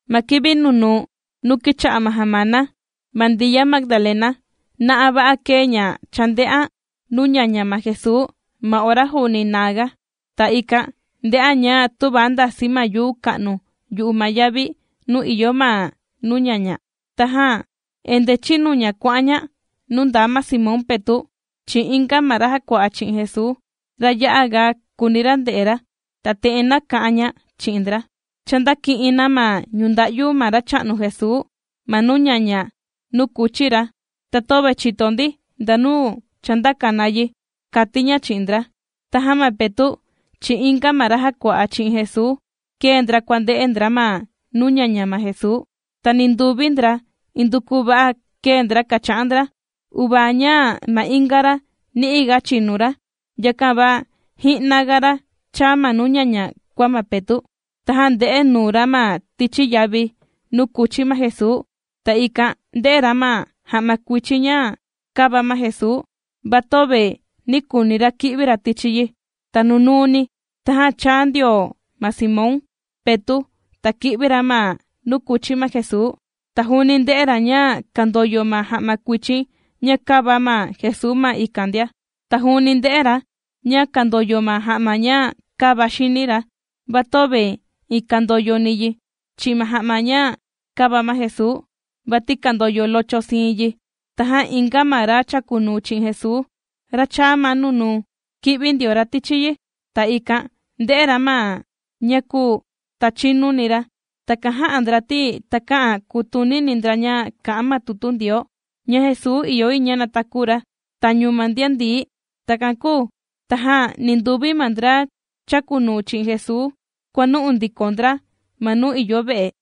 Ma kivi nunuu nuu kìcha'a ma jamana, ma Ndiya Magdalena, na'a va'a kēe ña chānde'an nuu ñaña ma Jesuu ma ora juuni naa ga. Ta ikan ndē'an ña tüva ndàsi ma yuu ka'nu yu'u ma yavi nuu ìyo ma nuu ñaña. Tajan endee chīnu ña kuà'an ña nuu ndaa ma Simón Petu', chi'in inga ma ra jàkua'a chi'in Jesuu, ra ya'a ga kùuni ra nde'e ra, ta te'en nāka'an ña chi'in ndra: ―Cha ndāki'in na ma ñunda'yu ma Racha'nu Jesuu ma nuu ñaña nuu kùchi ra, ta töve chìto ndi ndanu chāndaka na yi ―kàti ña chi'in ndra. Tajan ma Petu' chi'in inga ma ra jàkua'a chi'in Jesuu, kēe ndra kuànde'e ndra ma nuu ñaña ma Jesuu. Ta ninduvi ndra induku va'a kēe ndra kàcha'an ndra, uvaa ña ma inga ra ni'i ga chīnu ra, yakan va ji'naga ra chāa ma nuu ñaña kua ma Petu'. Tajan ndē'e nuu ra ma tichi yavi nuu kūchi ma Jesuu, ta ikan ndē'e ra ma ja'ma kuichin ña kāva ma Jesuu, va töve nī kuuni ra ki'vi ra tichi yi. Ta nunuuni tajan chāa ndio ma Simón Petu', ta kī'vi ra ma nuu kūchi ma Jesuu, ta juuni ndē'e ra ña kàndoyo ma ja'ma kuichin ña kāva ma Jesuu ma ikan ndia. Ta juuni ndē'e ra ña kàndoyo ma ja'ma ña kāva xini ra, va töve iin kandoyoni yi chi'in ma ja'ma ña kāva ma Jesuu, vati kàndoyo locho siin yi. Tajan inga ma ra chàkunuu chi'in Jesuu, ra chāa ma nunuu, kī'vi ndio ra tichi yi, ta ikan ndē'e ra ma ña kūu, ta chīnuni ra. Takan jā'a ndra ti takä'an kutunini ndra ña kà'an ma tutu Ndioo, ña Jesuu ìyo yi ña nataku ra tañu ma ndian ndií. Takan kūu tajan ninduvi ma ndra chàkunuu chi'in Jesuu kuànu'u ndiko ndra ma nuu ìyo ve'e.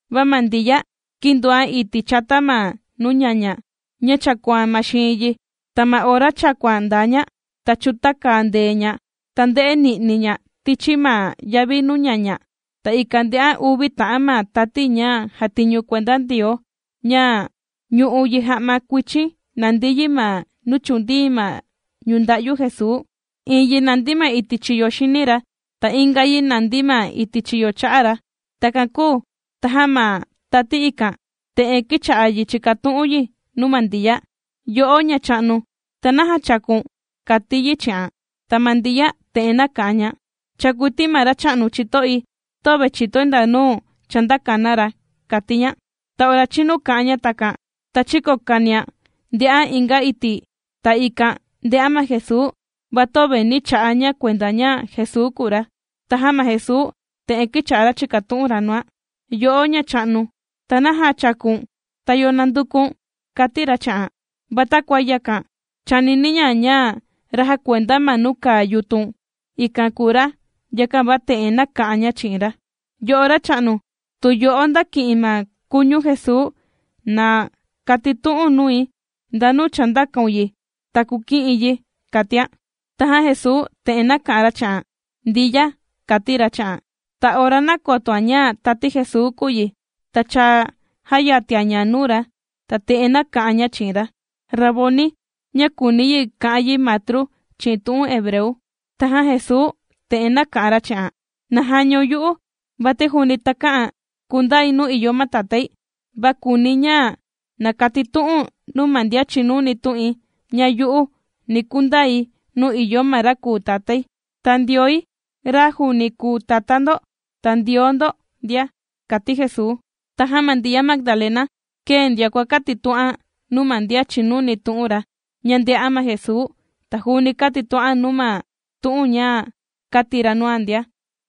Va ma Ndiya kīndoan iti' chata ma nuu ñaña, ña chàkuan ma xiin yi. Ta ma ora chàkuan ndaa ña, ta chūtaka ndee ña, ta ndē'e ni'ni' ña tichi ma yavi nuu ñaña. Ta ikan ndē'an uvi ta'an ma tati ña jàtiñu kuenda Ndioo, ña ñù'u yi ja'ma kuichin, nàndi yi ma nuu chūndii ma ñunda'yu Jesuu: iin yi nàndi ma iti' chiyo xini ra, ta inga yi nàndi ma iti' chiyo cha'a ra. Takan kūu, tajan ma tati ikan, te'en kīcha'a yi chìkatu'un yi nuu ma Ndiya: ―Yo'o ñacha'nu, ¿ta naja chàku̱n? ―kàti yi chi'an. Ta ma Ndiya te'en nāka'an ña: ―Chàkui ti ma Racha'nu chito'i, töve chìtoi ndanu chāndaka na ra ―kàti ña. Ta ora chīnu kā'an ña takan, ta chīkokanian ndē'an inga iti', ta ikan ndē'an ma Jesuu, va töve nī cha'a' ña kuenda ña Jesuu kùu ra. Tajan ma Jesuu te'en kīcha'a ra chìkatu'un ra nuan: ―Yo'o ma'á, ¿ta naja chàku̱n?, ¿Ta yo nànduku̱n? ―kàti ra chi'an. Va takua yakan chānini ña, ña ra jàkuenda ma nuu kàa yutun ikan kùu ra, yakan va te'en nāka'an ña chi'in ra: ―Yo'o racha'nu, tu yo'o ndāki'in ma kuñu Jesuu, na katitu'u̱n nui ndanu chāndakaun yi, ta kuki'i̱n yi ―kàtian. Tajan Jesuu te'en nāka'an ra chi'an: ―¡Ndiya! ―kàti ra chi'an. Ta ora nākotoan ña tati Jesuu kùu yi, ta cha jāyatian ña nuu ra, ta te'en nāka'an ña chi'in ra: ―¡Raboni! ―ña kùuni yi ka'an yi Matru chi'in tu'un hebreu. Tajan Jesuu te'en nāka'an ra chi'an: ―¡Na jañaun yu'u! Vati juuni takä'an kundai nuu ìyo ma Tatái. Va kùuni̱ ña na kukatitu'u̱n nuu ma ndian chìnuni tu'in, ña yu'u, ni kundai nuu ìyo ma ra kùu Tatái, ta ma Ndioi, ra juuni kùu Tatá ndo, ta Ndioo ndo ndia ―kàti Jesuu. Tajan ma Ndiya Magdalena kēe ndioan kuàkatitu'an nuu ma ndian chìnuni tu'un ra, ña ndē'an ma Jesuu. Ta juuni kātitu'an nuu na ma tu'un ña kāti ra nuan ndia.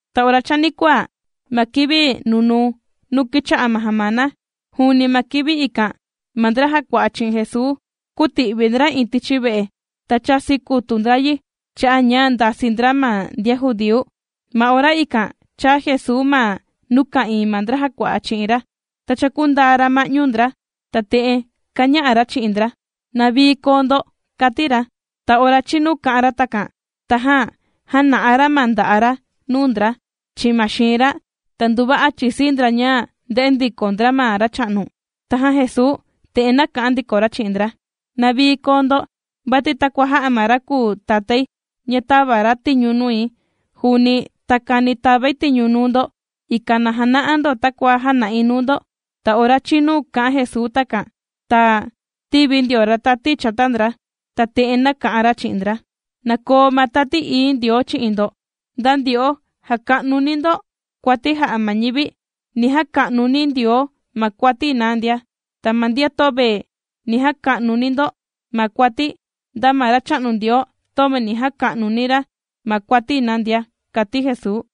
Ta ora chanikuaa, ma kivi nunuu nuu kìcha'a ma jamana; juuni ma kivi ikan, ma ndra jàkua'a chi'in Jesuu kūti'vi ndra iin tichi ve'e, ta chāsi kutu ndra yi cha'a' ña ndasii ndra ma ndian judíu. Ma ora ikan chāa Jesuu ma nuu ka'ìin ma ndra jàkua'a chi'in ra, ta chākundaa ra ma'ñu ndra, ta te'en kāña'a ra chi'in ndra: ―¡Na vii koo ndo! ―kàti ra. Ta ora chīnu kā'an ra takan, tajan jāna'a ra ma nda'a' ra nuu ndra, chi'in ma xiin ra. Ta nduva'a chīsii ndra ña ndē'e ndiko ndra ma Racha'nu. Tajan Jesuu te'en nāka'an ndiko ra chi'in ndra: ―¡Na vii koo ndo! Vati takua jā'a ma ra kùu Tatái ña tāva ra tiñu nui, juuni takani tàvai tiñu nuu ndo, ikan na jana'a ndo takua jāna'i nuu ndo. Ta ora chīnu kā'an Jesuu takan, ta tīvi ndio ra tati chata ndra, ta te'en nāka'an ra chi'in ndra: ―Na koo ma Tati Ií Ndioo chi'in ndo. Nda ndyo'o jàka'nuni ndo kuati jà'a ma ñivi, ni jaka'nuni Ndioo ma kuati na ndia. Ta ma ndian töve ni jaka'nuni ndo ma kuati, nda ma Racha'nu Ndioo, töve ni jaka'nuni ra ma kuati na ndia ―kàti Jesuu.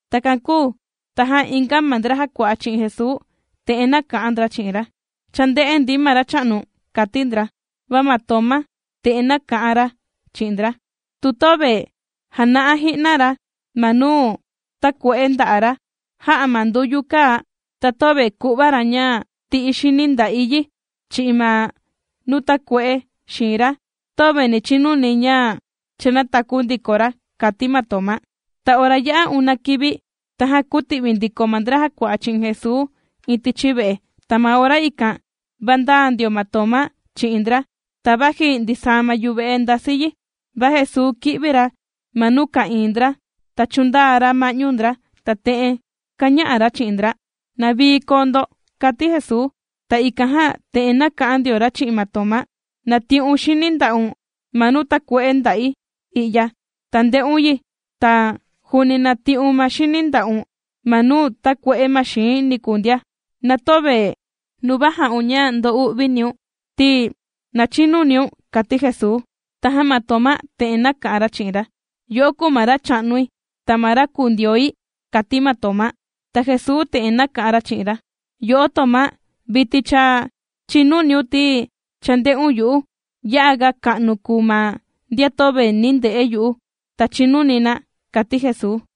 Takan kūu tajan inga ma ndra jàkua'a chi'in Jesuu, te'en nāka'an ndra chi'in ra: ―¡Cha ndē'e ndi ma Racha'nu! ―kàti ndra. Va ma Tomá te'en nāka'an ra chi'in ndra: ―Tu töve jàna'a ji'na ra ma nuu tākue'e nda'a' ra jā'a ma nduyu kàa, ta töve ku'va ra ña ti'i̱ xini nda'i yi, chi'in ma nuu tākue'e xiin ra, töve ni chinuni̱ ña cha nātaku ndiko ra ―kàti ma Tomá. Ta ora yā'a una kivi, tajan kūti'vi ndiko ma ndra jàkua'a chi'in Jesuu iin tichi ve'e. Ta ma ora ikan, va ndaa ndio ma Tomá, chi'in ndra. Ta vaji ndisaa ma yuve'e ndasi yi, va Jesuu kī'vi ra ma nuu ka'ìin ndra, ta chūndaa ra ma'ñu ndra, ta te'en kāña'a ra chi'in ndra: ―¡Na vii koo ndo! ―kàti Jesuu. Ta ikan jan te'en nāka'an ndio ra chi'in ma Tomá: ―Na ti'un xini nda'un ma nuu takue'e nda'i i'ya, ta nde'un yi, ta juuni na ti'un ma xini nda'un ma nuu tākue'e ma xii̱n niku ndia. Na töve nuva ja'un ña ndo'uviniun ti, na chinuniun ―kàti Jesuu. Tajan ma Tomá te'en nāka'an ra chi'in ra: ―¡Yo'o kùu ma Racha'nui, ta ma ra kùu Ndioi! ―kàti ma Tomá. Ta Jesuu te'en nāka'an ra chi'in ra: ―Yo'o Tomá, vitin cha chìnuniun ti, cha ndē'un yu'u. Ya'aga ka'nu kùu ma ndian töve nī nde'e yu'u, ta chīnuni na ―kàti Jesuu.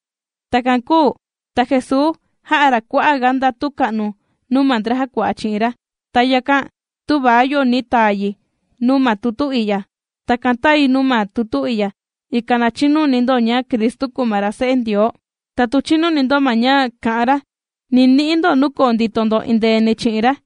Takan kūu ta Jesuu jā'a ra kua'a' ga ndatu ka'nu nuu ma ndra jàkua'a chi'in ra, ta yakan tüva yo ni taa yi nuu ma tutu i'ya. Takan tāi nuu ma tutu i'ya, ikan na chinuni ndo ña Cristu kùu ma ra Se'e Ndioo. Ta tu chìnuni ndo ma ña kà'an ra, ni ni'i ndo nuu koo ndito ndo endeeni chi'in ra.